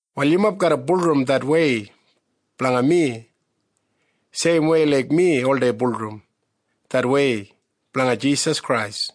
Wal yumob garra bulurrum det wei blanga mi seimwei laik mi oldei bulurrum det wei blanga Jisas Krais.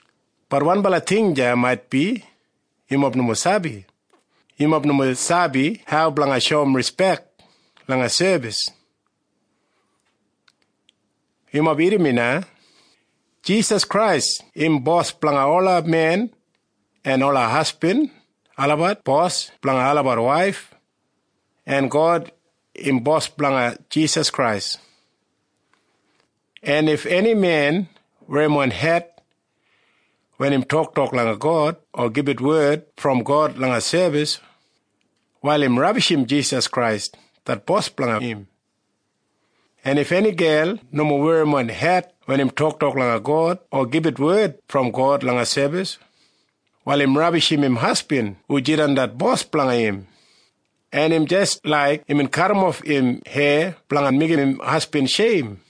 Bat wanbala ting deya maitbi yumob nomo sabi. Yumob nomo sabi hau blanga shoum rispek langa sebis. Yumob irrim mi na. Jisas Krais im Bos blanga ola men, en ola hasbin olabat bos blanga olabat waif, en God im Bos blanga Jisas Krais. En if eni men werrimon het wen im toktok langa God o gibit wed brom God langa sebis, wal im rabishim Jisas Krais det Bos blanga im. En if eni gel nomo werrimon het wen im toktok langa God o gibit wed brom God langa sebis, wal im rabishim im hasbin hu jidan det bos blanga im, en im jis laik imbin kadimof im heya blanga meigim im hasbin sheim.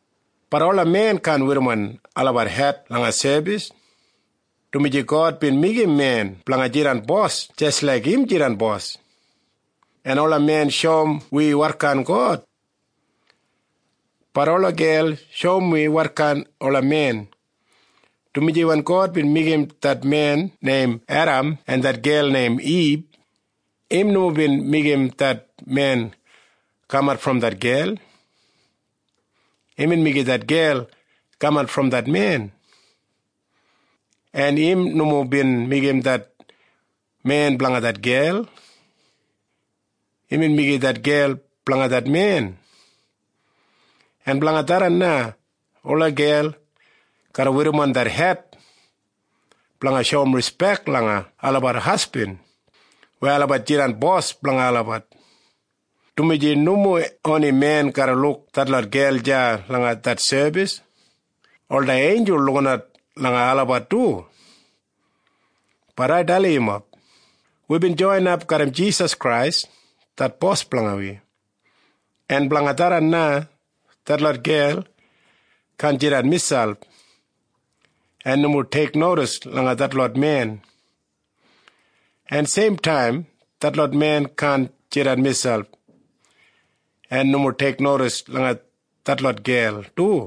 Bat ola men kaan werrimon olabat het langa sebis, dumaji God bin meigim men blanga jidan bos jis laik im jidan Bos, en ola men shoum wi wotkain God. Bat ola gel shoum wi wotkain ola men, dumaji wen God bin meigim det men neim Edam en det gel neim Ib, im nomo bin meigim det men kamat brom det gel. Imbin meigim det gel kamat brom det men. En im nomo bin meigim det men blanga det gel. Imbin meigim det gel blanga det men. En blanga tharran na ola gel garra werrimon det het blanga shoum rispek langa olabat hasbin weya olabat jidan bos blanga olabat, dumaji nomo oni men garra luk detlot gel deya langa det sebis. Ola einjul lukinat langa olabat du. Bat ai dalim yumob. Wibin joinap garram Jisas Krais det Bos blanga wi, en blanga tharran na detlot gel kaan jidan miselp en nomo teiknodis langa detlot men, en seimtaim detlot men kaan jidan miselp en nomo teiknodis langa detlot gel du.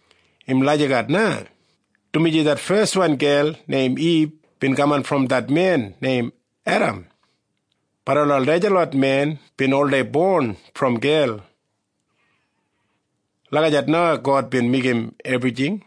Im lagijat na, dumaji det feswan gel neim Ib bin kamat brom det men neim Edam, bat ola najalot men bin oldei bon brom gel. Lagijat na God bin meigim ebrijing.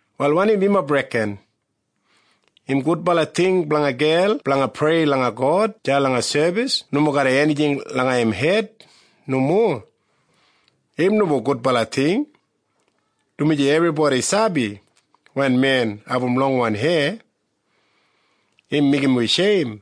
Wal wanim yumob reken? Im gudbala ting blanga gel blanga prei langa God deya langa sebis nomo garram enijing langa im hed? Nomo. Im nomo gudbala ting, dumaji ebribodi sabi wen men abum longwan heya, im meigim wi sheim.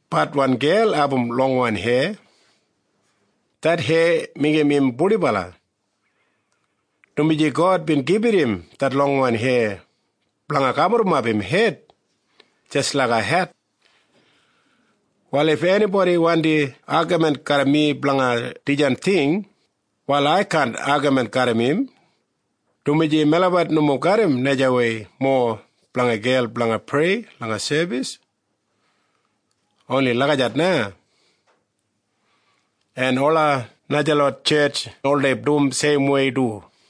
Bat wen gel abum longwan heya, det heya meigim im purdibala, dumaji God bin gibit im det longwan heya blanga gaburrumap im hed jis laiga het. Wal if enibodi wandi agamin garram mi blanga dijan ting, wal ai kaan agamin garram im, dumaji melabat nomo garram najawei mowa blanga gel blanga prei langa sebis. Oni lagijat na. En ola najalot tjetj oldei dum seimwei du.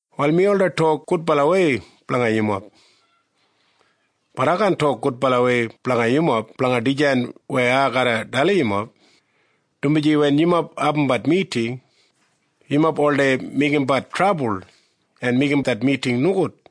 Wal mi oldei tok gudbalawei blanga yumob. Bat ai kaan tok gudbalawei blanga yumob blanga dijan weya ai garra dalim yumob, dumaji wen yumob abumbat miting, yumob oldei meigimbat trabul en meigim det miting nogud.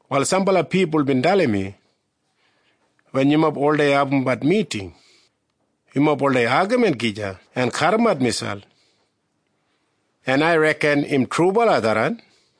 Wal sambala pipul bin dalim mi, wen yumob oldei abumbat miting, yumob oldei agamin gija en kadimat miselp. En ai reken im trubala tharran.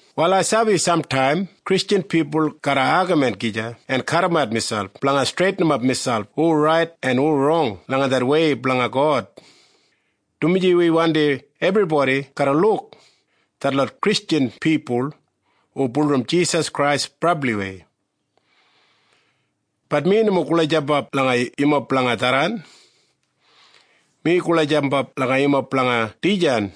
Wal ai sabi samtaim Kristjan pipul garra agamin gija en kadimat miselp blanga streitinimap miselp hu rait en hu rong langa det wei blanga God, dumaji wi wandim ebribodi garra luk detlot Kristjan pipul hu bulurrum Jisas Krais brabliwei. Bat mi nomo gulajambap langa yumob blanga tharran. Mi gulajambap langa yumob blanga dijan.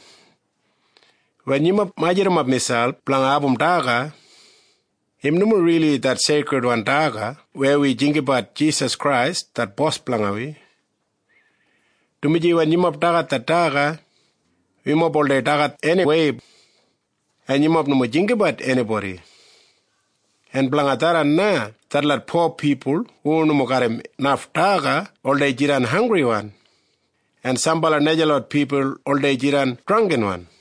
Wen yumob majurrumap miselp blanga abum daga, im nomo rili det seikridwan daga weya wi jinggabat Jisas Krais det Bos blanga wi, dumaji wen yumob dagat det daga, yumob oldei dagat eniwei, en yumob nomo jinggabat enibodi, en blanga tharran na detlot po pipul hu nomo garram naf daga oldei jidan hanggriwan, en sambala najalot pipul oldei jidan drangginwan.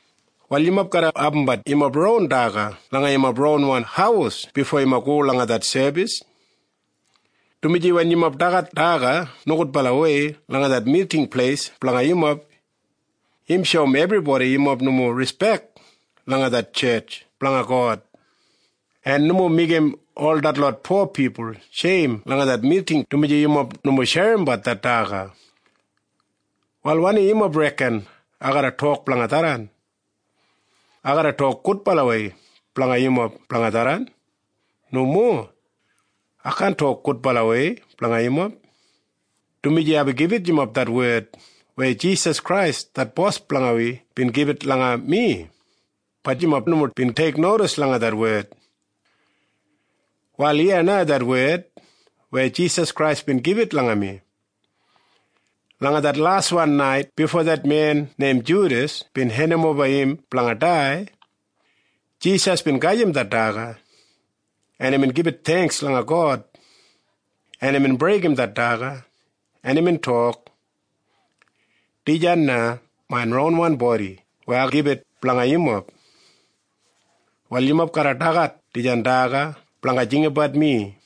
Wal yumob garra abumbat yumob ron daga langa yumob ron haus bifo yumob go langa det sebis, dumaji wen yumob dagat daga nogudbalawei langa det miting pleis blanga yumob, im shoum ebribodi yumob nomo rispek langa det tjetj blanga God, en nomo meigim ol detlot po pipul sheim langa det miting dumaji yumob nomo sherimbat det daga. Wal wanim yumob reken ai garra tok blanga tharran? Ai garra tok gudbalawei blanga yumob blanga tharran? Nomo. Ai kaan tok gudbalawei blanga yumob, dumaji aibin gibit yumob det wed weya Jisas Krais det Bos blanga wi bin gibit langa mi. Bat yumob nomo bin teiknodis langa det wed. Wal iya na det wed weya Jisas Krais bin gibit langa mi. Langa det laswan nait bifo det men neim Judas bin hendimoba im blanga dai, Jisas bin gajim det daga, en imbin gibit theingks langa God, en imbin breigim det daga, en imbin tok, “Dijan na main ronwan bodi weya ai gibit blanga yumob. Wal yumob garra dagat dijan daga blanga jinggabat mi.”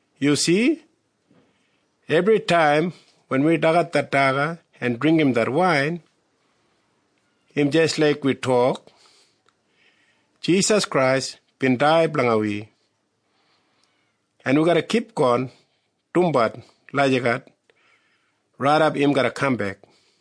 Yu si? Ebritaim wen wi dagat det daga en dringgim det wain, im jis laik wi tok, “Jisas Krais bin dai blanga wi.” En wi garra kipgon dumbat lagijat raidap im garra kambek.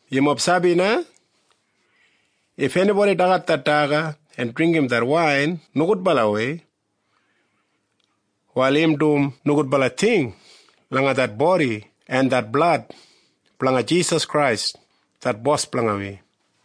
Yumob sabi na? If enibodi dagat det daga en dringgim det wain nogudbalawei, wal im dum nogudbala ting langa det bodi en det blad blanga Jisas Krais det Bos blanga wi.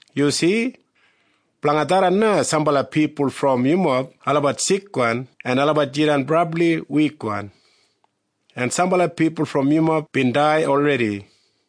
Yu si? Blanga tharran na sambala pipul brom yumob olabat sikwan en olabat jidan brabli wikwan, en sambala pipul brom yumob bin dai olredi.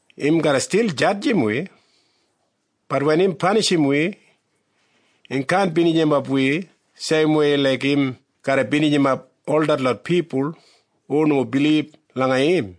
Im garra stil jadjim wi. Bat wen im panishim wi, im kaan binijimap wi seimwei laik im garra binijimap ol detlot pipul hu nomo bilib langa im.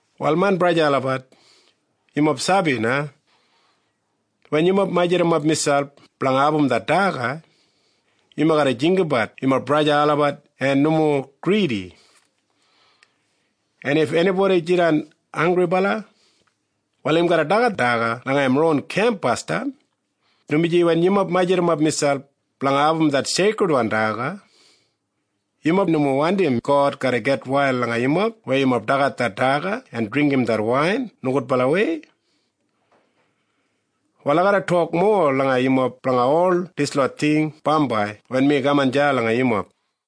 Wal main braja en sista olabat, yumob sabi na? Wen yumob majurrumap miselp blanga abum det daga, yumob garra jinggabat yumob braja en sista olabat en nomo gridi. En if enibodi jidan hanggribala, wal im garra dagat daga langa im ron kemp basdam, dumaji wen yumob majurrumap miselp blanga abum det seikridwan daga, yumob nomo wandim God garra gitwail langa yumob weya yumob dagat det daga en dringgim det wain nogudbalawei. Wal ai garra tok mowa langa yumob blanga ol dislot ting bambai wen mi kaman deya langa yumob.